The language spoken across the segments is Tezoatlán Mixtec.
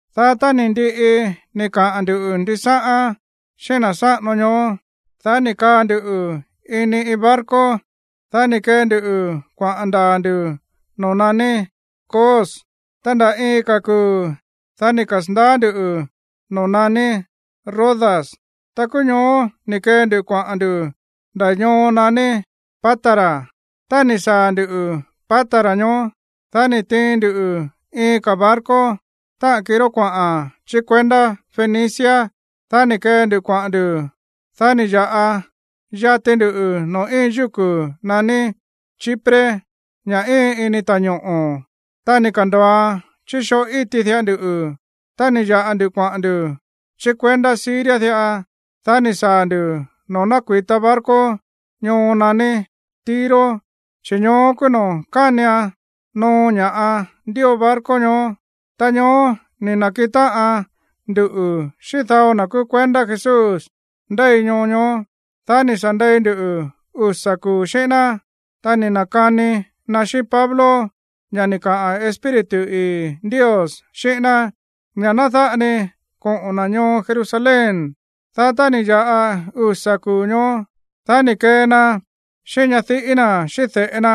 Dá tá ni̱ ndiꞌi ni̱ kaꞌa̱n ndu̱ ndisáꞌán xíꞌín na̱ sáꞌano ñoó, dá ni̱ kaa ndu ini iin barco. Dá ni̱ kee ndu kuaꞌa̱n ndaa̱ ndu̱ noo̱ naní Cos. Ta nda̱ iin ka̱ kuu̱, dá ni̱ kasa̱ndaá ndu̱ noo̱ naní Rodas. Ta kúú ñoó ni̱ kee ndu kuaꞌa̱n ndu̱ nda̱ ñoo naní Pátara. Tá ni̱ saa̱ ndu̱ Pátara ñoó, dá ni̱ tiin ndu iin ka̱ barco, táꞌa̱n kiró kuaꞌa̱n chí kuendá Fenicia. Dá ni̱ kee ndu kuaꞌa̱n ndu̱. Dá ni̱ ya̱ꞌa yati ndu noo̱ íin yúku̱ naní Chipre, ña̱ íin ini ta̱ñoꞌo̱. Ta ni̱ ka̱ndo̱oan chí xoo íti diꞌa ndu. Ta ni̱ ya̱ꞌa ndu kuaꞌa̱n ndu̱ chí kuendá Siria diꞌa. Dá ni̱ saa̱ ndu̱ noo̱ nákui̱ta barco ñoo naní Tiro, chi̱ ñoó kúú noo̱ kánian noo ña̱ꞌa ndío barco ñoó. Ta ñoó ni̱ na̱kiꞌin táꞌan ndu xíꞌín dao na̱ kúú kuendá Jesús ndéi ñoo ñoó. Dá ni̱ sa̱ ndei ndu usa̱ kuu̱ xíꞌín ná. Ta ni̱ na̱kani na xíꞌín Pablo ña̱ ni̱ kaꞌa̱n Espíritu ii̱ Ndios xíꞌín ná, ña̱ ná dáꞌa ni koꞌo̱n na̱ ñoo Jerusalén. Dá tá ni̱ ya̱ꞌa usa̱ kuu̱ ñoó, dá ni̱ kee na xíꞌín ñadiꞌí na̱ xíꞌín de̱ꞌe na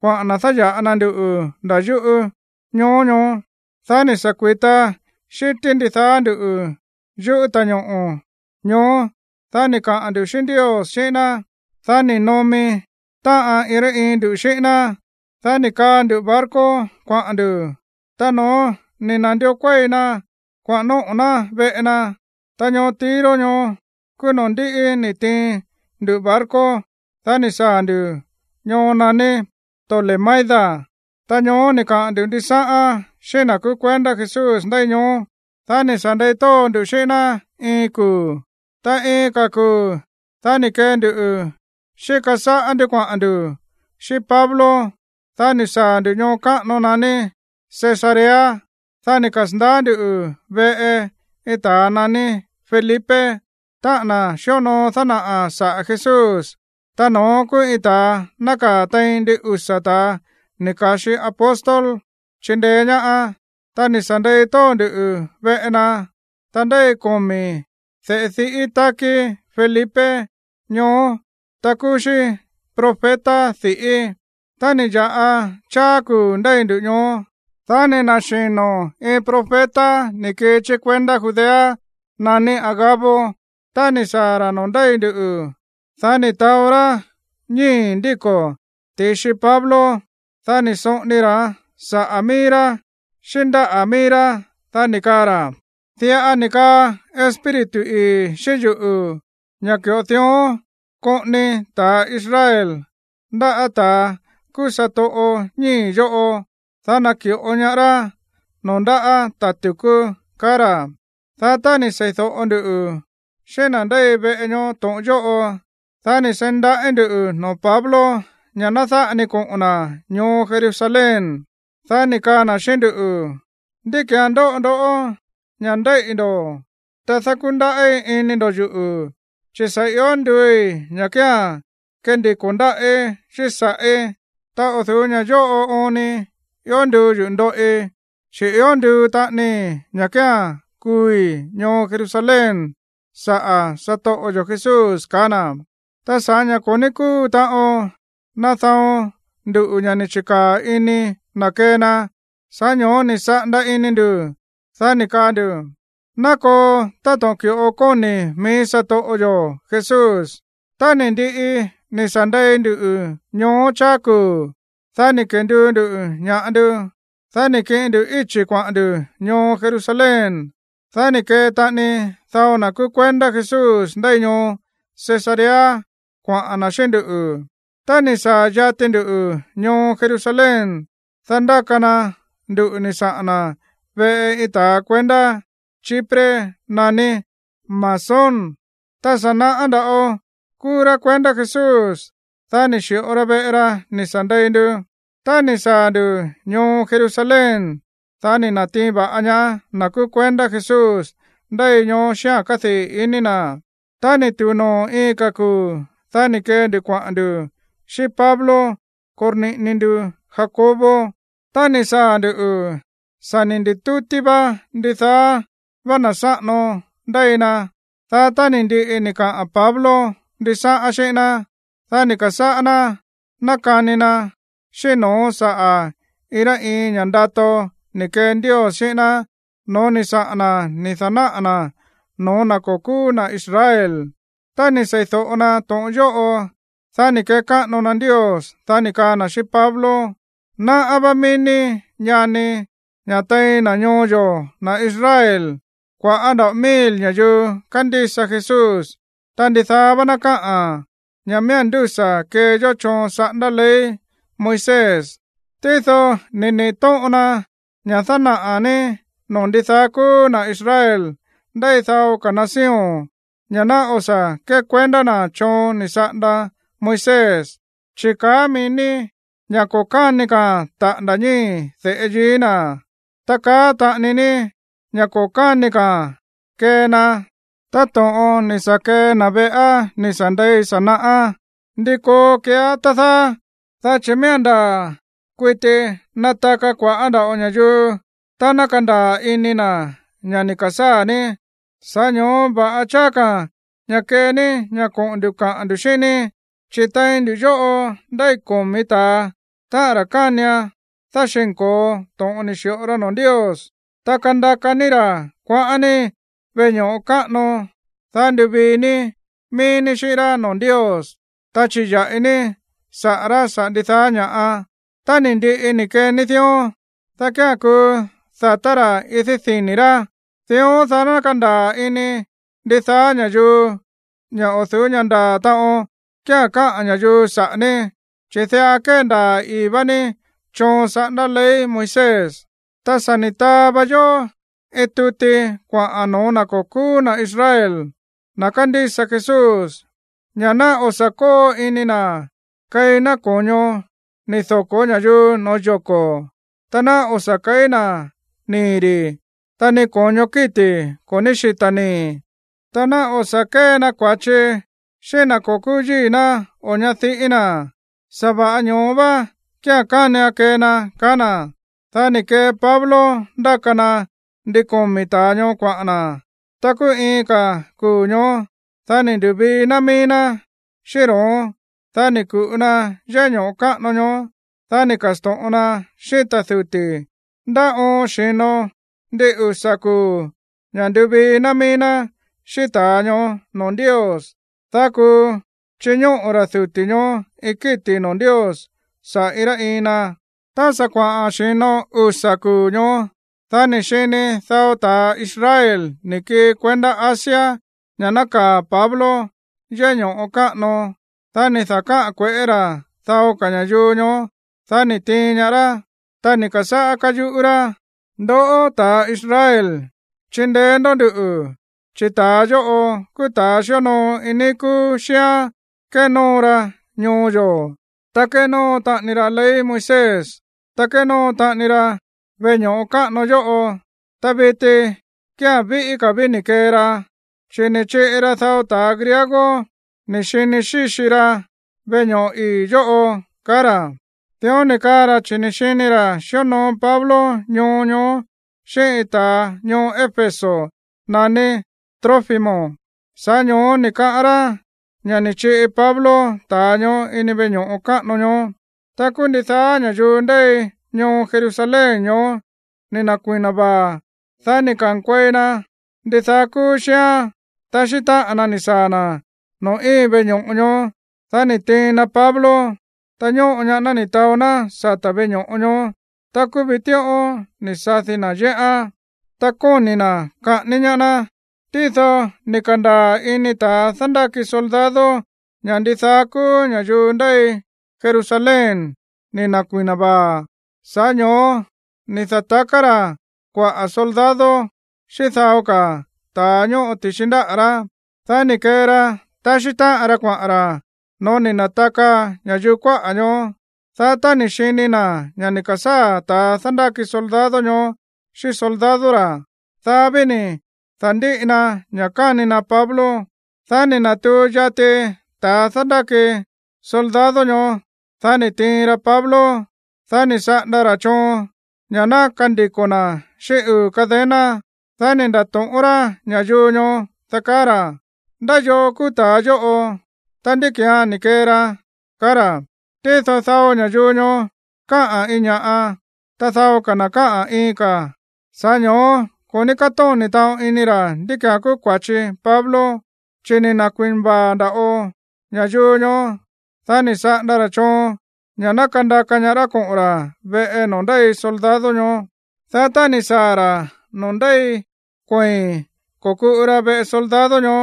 kuaꞌa̱n na̱ dáya̱ꞌa na nduꞌu̱ nda̱ yúꞌu̱ ñoo ñoó. Dá ni̱ sa̱ kui̱ta xi̱tí ndidaá ndú yúꞌu̱ ta̱ñoꞌo̱ ñoó, dá ni̱ kaꞌa̱n ndu̱ xíꞌín Ndios xíꞌín ná. Dá ni̱ nomi táꞌan iin rá iin ndu xíꞌín ná. Dá ni̱ kaa ndu barco kuaꞌa̱n ndu̱. Ta no̱ón, ni̱ na̱ndió kuéi na kuaꞌa̱n nóꞌo̱ ná veꞌe na. Ta ñoo Tiro ñoó kúú noo̱ ndíꞌi ni̱ tiin ndu barco, dá ni̱ saa̱ ndu̱ ñoo naní Tolemaida. Ta ñoó ni̱ kaꞌa̱n ndu̱ ndisáꞌán xíꞌín na̱ kúú kuendá Jesús ndéi ñoó. Dá ni̱ sa̱ ndei tóo ndu xíꞌín ná iin kuu̱. Ta iin ka̱ kuu̱, dá ni̱ kee ndu xíka sáꞌá ndú kuaꞌa̱n ndu̱ xíꞌín Pablo. Dá ni̱ saa̱ ndu̱ ñoo káꞌano naní Cesarea. Dá ni̱ kasa̱ndaá ndu̱ veꞌe iin ta̱a naní Felipe, táꞌa̱n na̱ xíonoo dánaꞌa̱ saꞌa̱ Jesús. Ta no̱ón kúú iin ta̱a nákaa̱ tein ndin usa̱ ta̱a ni̱ ka̱xi apóstol chindeé ñaá. Ta ni̱ sa̱ ndei tóo ndu veꞌe na. Ta ndéi komi̱ de̱ꞌe diꞌí tákí Felipe ñoó, ta kúú xí profeta di̱ꞌí. Tá ni̱ ya̱ꞌa cháá kuu̱ ndéi ndu ñoó, dá ni̱ na̱xino̱ iin profeta ni̱ kii chí kuendá Judea naní Agabo. Tá ni̱ saa̱ ra̱ noo̱ ndéi ndu, dá ni̱ taó rá ñíi̱ ndíko̱ ti̱xi Pablo. Dá ni̱ soꞌoni ra̱án saꞌa̱ mií rá xíꞌín ndáꞌa̱ mií rá. Dá ni̱ kaa ra̱: ―Diꞌa ni̱ kaꞌa̱n Espíritu ii̱ xíꞌín yuꞌu̱ ña̱ ki̱ꞌo diꞌa koꞌoni ta̱ Israel ndáꞌa̱ ta̱ kúú satoꞌo ñíi̱ yóꞌo, dá naki̱ꞌo ñaá rá noo̱ ndáꞌa̱ ta̱ tu̱kú ―kaá ra̱. Dá tá ni̱ sei̱do̱ꞌo nduꞌu̱ xíꞌín na̱ ndéi veꞌe ñoó to̱ꞌon yóꞌo, dá ni̱ seí ndaꞌí ndu̱ noo̱ Pablo ña̱ ná dáꞌa ni koꞌo̱n na̱ ñoo Jerusalén. Dá ni̱ kaa na̱ xíꞌín nduꞌu̱: ―¿Ndí ki̱án ndóꞌo ndó ña̱ ndéíꞌi̱ ndo̱, ta dákundaꞌí ini ndo̱ yuꞌu̱? Chi̱ sa̱ io nduui̱ ña̱ kía̱n kandiko̱ ndáꞌí xíꞌín sa̱ꞌí. Ta o̱ du̱ú ña̱ yóꞌo oon ni ió nduu yuꞌu̱ ndoꞌi, chi̱ ió nduu taꞌanii ña̱ kía̱n kuui̱ ñoo Jerusalén saꞌa̱ satoꞌo yo̱ Jesús ―kaá na̱. Ta sa̱ꞌá ña̱ ko̱ ní kúu taꞌon nadaon ndu ña̱ ni̱ chi̱kaa̱ ini na̱ kee na, sa̱ꞌá ño̱ó ni̱ saꞌanda ini ndu̱, dá ni̱ kaa ndu̱: ―Ná koo táto̱ꞌon ki̱ꞌo kóni̱ mií satoꞌo yo̱ Jesús. Tá ni̱ ndiꞌi ni̱ sa̱ ndei ndu ñoó cháá kuu̱, dá ni̱ kenduu ndu̱ ña̱ꞌa ndu, dá ni̱ kiꞌin ndu íchi̱ kuaꞌa̱n ndu̱ ñoo Jerusalén. Dá ni̱ kee taꞌani dao na̱ kúú kuendá Jesús ndéi ñoo Cesarea kuaꞌa̱n na̱ xíꞌín ndú. Tá ni̱ saa̱ yati ndu ñoo Jerusalén, dá ndáka na nduꞌu̱ ni̱ saꞌa̱n na̱ veꞌe iin ta̱ kuendá Chipre naní Mnasón. Ta sa̱ naꞌá nda̱ꞌo kúú rá kuendá Jesús. Dá ni̱ xi̱ꞌo ra veꞌe ra ni̱ sa̱ ndei ndu. Tá ni̱ saa̱ ndu̱ ñoo Jerusalén, dá ni̱ na̱tiin va̱ꞌa ñaá na̱ kúú kuendá Jesús ndéi ñoó xíꞌa̱n kádii̱ ini na̱. Tá ni̱ tu̱u noo̱ iin ka̱ kuu̱, dá ni̱ kee ndu kuaꞌa̱n ndu̱ xíꞌín Pablo korniꞌini ndu Jacobo. Tá ni̱ saa̱ ndu̱, sa̱ ni̱ ndi̱tútí ndidaá vá na̱ sáꞌano ndéi na. Dá tá ni̱ ndiꞌi ni̱ kaꞌa̱n Pablo ndisáꞌán xíꞌín ná, dá ni̱ ka̱sáꞌá ná nákani na xíꞌín no̱ón saꞌa̱ iin rá iin ña̱ ndato ni̱ kee Ndios xíꞌín ná no̱ó ni̱ saꞌa̱n na̱ ni̱ da̱náꞌa̱ na̱ no̱ó na̱ ko̱ kúú na̱ Israel. Tá ni̱ seídóꞌo na to̱ꞌon yóꞌo, dá ni̱ kekáꞌano na Ndios. Dá ni̱ kaa na̱ xíꞌín Pablo: ―Náꞌá vá mií ní, ñani, ña̱ tein na̱ ñoo yo̱, na̱ Israel, kua̱ꞌá nda̱ꞌo mil ña̱yuu kándísa Jesús, ta ndidaá vá ná káꞌa̱n ña̱ miía̱n ndúsa̱ kee yó choon saꞌándá ley Moisés. Tído ni̱ niꞌi̱ tóꞌon na ña̱ dánaꞌa̱ ní noo̱ ndidaá kúú na̱ Israel ndéi dao ka̱ nación ña̱ ná o̱ sa̱ kékuendá na̱ choon ni̱ saꞌanda Moisés, chi̱ kaá mií ní ña̱ ko̱ káni ka̱a̱n taꞌa̱nda̱ ñíi̱ de̱ꞌe yií na̱, ta kaá taꞌani ní ña̱ ko̱ káni ka̱a̱n kee na táto̱ꞌon ni̱ sa̱ kee na̱ veꞌá ni̱ sa̱ ndei sa̱ naꞌá. ’¿Ndi koo keeá, tá dáá? Dá chi̱ miía̱n ndaa̱ kuiti nataka kua̱ꞌá nda̱ꞌo ña̱yuu tá ná kandaa̱ ini na̱ ña̱ ni̱ ka̱sáa̱ ní. Sa̱ꞌá ño̱ó va̱ꞌa cháá ka̱ ña̱ kee ní ña̱ koꞌo̱n ndu̱ kaꞌa̱n ndu̱ xíꞌín ní: Chi̱ tein nduꞌu̱ yóꞌo ndéi komi̱ ta̱a, táꞌa̱n ra̱ kánian dáxi̱nko̱o to̱ꞌon ni̱ xi̱ꞌo ra noo̱ Ndios. Ta kandaka ní ra̱ kuaꞌa̱n ní veꞌe ño̱ꞌo káꞌano. Dá nduvii ní mií ní xíꞌín rá noo̱ Ndios, ta chiya̱ꞌi ní saꞌa̱ rá saꞌa̱ ndidaá ña̱ꞌa. Tá ni̱ ndiꞌi ni̱ kee ní dión, dá kía̱n kuu da̱tá ra̱ idí dini̱ rá. Dión, dá ná kandaa̱ ini ndidaá ña̱yuu ña̱ o̱ du̱ú ña̱ ndaa̱ taꞌon kía̱n káꞌa̱n ña̱yuu saꞌa̱ ní, chi̱ diꞌa kéndaa̱ ii̱ vá ní choon saꞌándá ley Moisés. ’Ta sa̱ ni̱ taa va yó iin tuti kuaꞌa̱n no̱ó na̱ ko̱ kúú na̱ Israel, na̱ kándísa Jesús, ña̱ ná o̱ sa̱ kóo ini na̱ keí ná ko̱ño ni̱ doko̱ ña̱yuu no̱ó yoko̱, ta ná o̱ sa̱ keí ná nii̱ ri̱, ta ni ko̱ño kíti̱ ko̱ ní xíta̱ nii̱, ta ná o̱ sa̱ kée na kua̱chi xíꞌín na̱ ko̱ kúú yíi̱ ná o ñadiꞌí na̱. Sa̱va̱ꞌa ñoó vá kía̱n kánian kee na ―kaá na̱. Dá ni̱ kee Pablo ndáka na ndin komi̱ ta̱a ñoó kuaꞌa̱n na̱. Ta kúú iin ka̱ kuu̱ ñoó, dá ni̱ ndu̱vii ná mií ná xíꞌín ro̱ón. Dá ni̱ ku̱ꞌu na yéꞌé ño̱ꞌo káꞌano ñoó, dá ni̱ ka̱sto̱ꞌon na xíꞌín ta̱ duti̱ ndá oon xi̱no ndin usa̱ kuu̱ ña̱ nduvii ná mií ná xíꞌín ta̱a ñoó noo̱ Ndios, dá kuu chiñóꞌo̱ ta̱ duti̱ ñoó iin kíti̱ noo̱ Ndios saꞌa̱ iin rá iin na. Tá sa̱ kuaꞌa̱n xi̱no usa̱ kuu̱ ñoó, dá ni̱ xini dao ta̱a Israel ni̱ kii kuendá Asia ña̱ nákaa̱ Pablo yéꞌé ño̱ꞌo káꞌano. Dá ni̱ da̱káꞌa̱n kue̱ꞌé ra̱ dao ka̱ ña̱yuu ñoó. Dá ni̱ tiin ñaá rá. Ta ni̱ ka̱sáꞌá káyuꞌú rá: ―¡Ndoꞌó, ta̱a Israel, chindeé ndó nduꞌu̱, chi̱ ta̱a yóꞌo kúú ta̱a xíonoo iin níí kúú xíán kénóo ra ñoo yo̱, ta kénóo taꞌani ra ley Moisés, ta kénóo taꞌani ra veꞌe ño̱ꞌo káꞌano yóꞌo! Ta viti kía̱n víꞌí ka̱ ví ni̱ kee ra, chi̱ ni̱ chiꞌi ra dao ta̱ griego ni̱ xini xíxi ra veꞌe ño̱ꞌo ii̱ yóꞌo ―kaá ra̱. Dión ni̱ kaa ra̱ chi̱ ni̱ xini ra̱ xíonoo Pablo ñoo ñoó xíꞌín iin ta̱a ñoo Éfeso naní Trófimo. Sa̱ꞌá ño̱ó ni̱ kaꞌán rá ña̱ ni̱ chiꞌi Pablo ta̱a ñoó ini veꞌe ño̱ꞌo káꞌano ñoó. Ta kúú ndidaá ña̱yuu ndéi ñoo Jerusalén ñoó ni̱ na̱kui̱na vaa̱. Dá ni̱ ka̱nkuei na ndidaá kúú xíán taxí táꞌan na ni̱ saa̱ na̱ noo̱ íin veꞌe ño̱ꞌo ñoó. Dá ni̱ tiin na Pablo, ta ñóꞌo ñaá ná ni̱ taó ná sata̱ véꞌe ño̱ꞌo ñoó. Ta kúú vitíꞌón ni̱ sadi na̱ yéꞌán. Ta kóni̱ na̱ kaꞌání ñaá ná. Tído ni̱ ka̱ndaa̱ ini ta̱a dándáki soldado ña̱ ndidaá kúú ña̱yuu ndéi Jerusalén ni̱ na̱kui̱na vaa̱. Sa̱ꞌá ño̱ó ni̱ da̱taká ra̱ kuaꞌa̱ soldado xíꞌín dao ka̱ ta̱a ñóꞌo ti̱xi ndáꞌa̱ rá. Dá ni̱ kee ra taxí táꞌan ra kuaꞌa̱n ra̱ no̱ó ni̱ na̱taka ña̱yuu kuáꞌa̱ ñoó. Dá tá ni̱ xini na̱ ña̱ ni̱ ka̱sáa̱ ta̱a dándáki soldado ñoó xíꞌín soldado ra̱, dá ví ni̱ da̱ndíꞌi na ña̱ káni na Pablo. Dá ni̱ na̱tuu yati ta̱a dándáki soldado ñoó, dá ni̱ tiin ra Pablo. Dá ni̱ saꞌanda ra̱ choon ña̱ ná kandiko̱ na̱ xíꞌín uu̱ cadena. Dá ni̱ nda̱to̱ꞌón rá ña̱yuu ñoó, tá kaá ra̱: ―¿Ndá yoo kúú ta̱a yóꞌo? Ta, ¿ndí ki̱án ni̱ kee ra? ―kaá ra̱. Tído dao ña̱yuu ñoó káꞌa̱n iin ña̱ꞌa, ta dao ka̱ na̱ káꞌa̱n iin ka̱a̱n. Sa̱ꞌá ño̱ó ko̱ ní kátóni̱ taꞌon ini ra̱ ndí ki̱án kúú kua̱chi Pablo, chi̱ ni̱ na̱kui̱na vaa̱ nda̱ꞌo ña̱yuu ñoó. Dá ni̱ saꞌanda ra̱ choon ña̱ ná kandaka ñaá rá koꞌo̱n ra̱ veꞌe noo̱ ndéi soldado ñoó. Dá tá ni̱ saa̱ ra̱ noo̱ ndéi kuei̱n ko̱kuꞌu ra veꞌe soldado ñoó,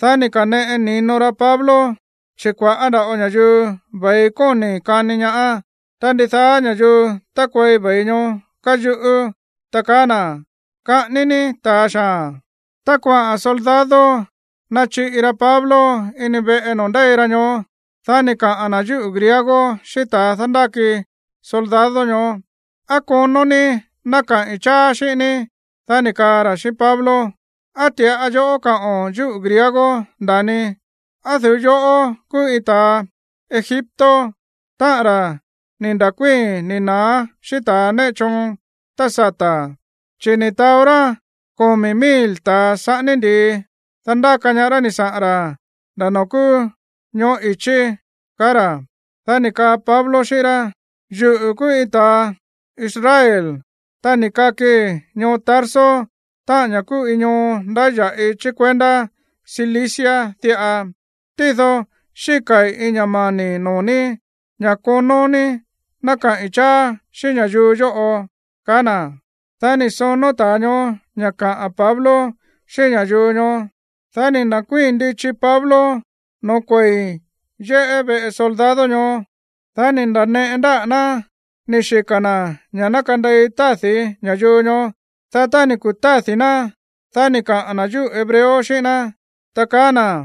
dá ni̱ ka̱neꞌe ni̱no ra Pablo, chi̱ kua̱ꞌá nda̱ꞌo ña̱yuu ve̱i kóni̱ kani ñaá. Ta ndidaá ña̱yuu tákuei ve̱i ñoó káyuꞌú, ta kaá na̱: ―¡Kaꞌání ní ta̱a xaa̱n! Tá kuaꞌa̱n soldado nachiꞌi ra Pablo ini veꞌe noo̱ ndéi ra ñoó, dá ni̱ kaꞌa̱n na̱ yúꞌu̱ griego xíꞌín ta̱a dándáki soldado ñoó: ―¿Á konó ní ná kaꞌi̱n cháá xíꞌín ní? Dá ni̱ kaa ra̱ xíꞌín Pablo: ―¿Á ti̱ꞌa yoꞌó káꞌo̱n yúꞌu̱ griego, nda̱ni? ¿Á o̱ du̱ú yoꞌó kúú iin ta̱a Egipto, táꞌa̱n ra̱ ni̱ nda̱kuíi̱n ni̱ na̱á xíꞌín ta̱ néꞌe choon tá sata̱? Chi̱ ni̱ taó rá komi̱ mil ta̱a saꞌání ndi̱i, dá ndáka ñaá rá ni̱ saꞌa̱n ra̱ nda̱ noo̱ kúú ñoꞌó i̱chí ―kaá ra̱. Dá ni̱ kaa Pablo xíꞌín rá: ―Yuꞌu̱ kúú iin ta̱ Israel, ta ni̱ kakii ñoo Tarso, táꞌa̱n ña̱ kúú iin ñoo ndáya̱ꞌi chí kuendá Cilicia diꞌa. Tído xíka̱i̱ iin ña̱ mani̱ noo̱ ní ña̱ konó ní ná kaꞌi̱n cháá xíꞌín ña̱yuu yóꞌo ―kaá na̱. Dá ni̱ sonó ta̱a ñoó ña̱ kaꞌa̱n Pablo xíꞌín ña̱yuu ñoó. Dá ni̱ na̱kuíi̱n ndichi Pablo noo̱ kuei̱n yéꞌé veꞌe soldado ñoó. Dá ni̱ nda̱neꞌe na ndáꞌa̱ ná ni̱ xika̱ na̱ ña̱ ná kandei tádi̱ ña̱yuu ñoó. Dá tá ni̱ kutádi̱ ná, dá ni̱ kaꞌa̱n na̱ yúꞌu̱ hebreo xíꞌín ná, ta kaá na̱: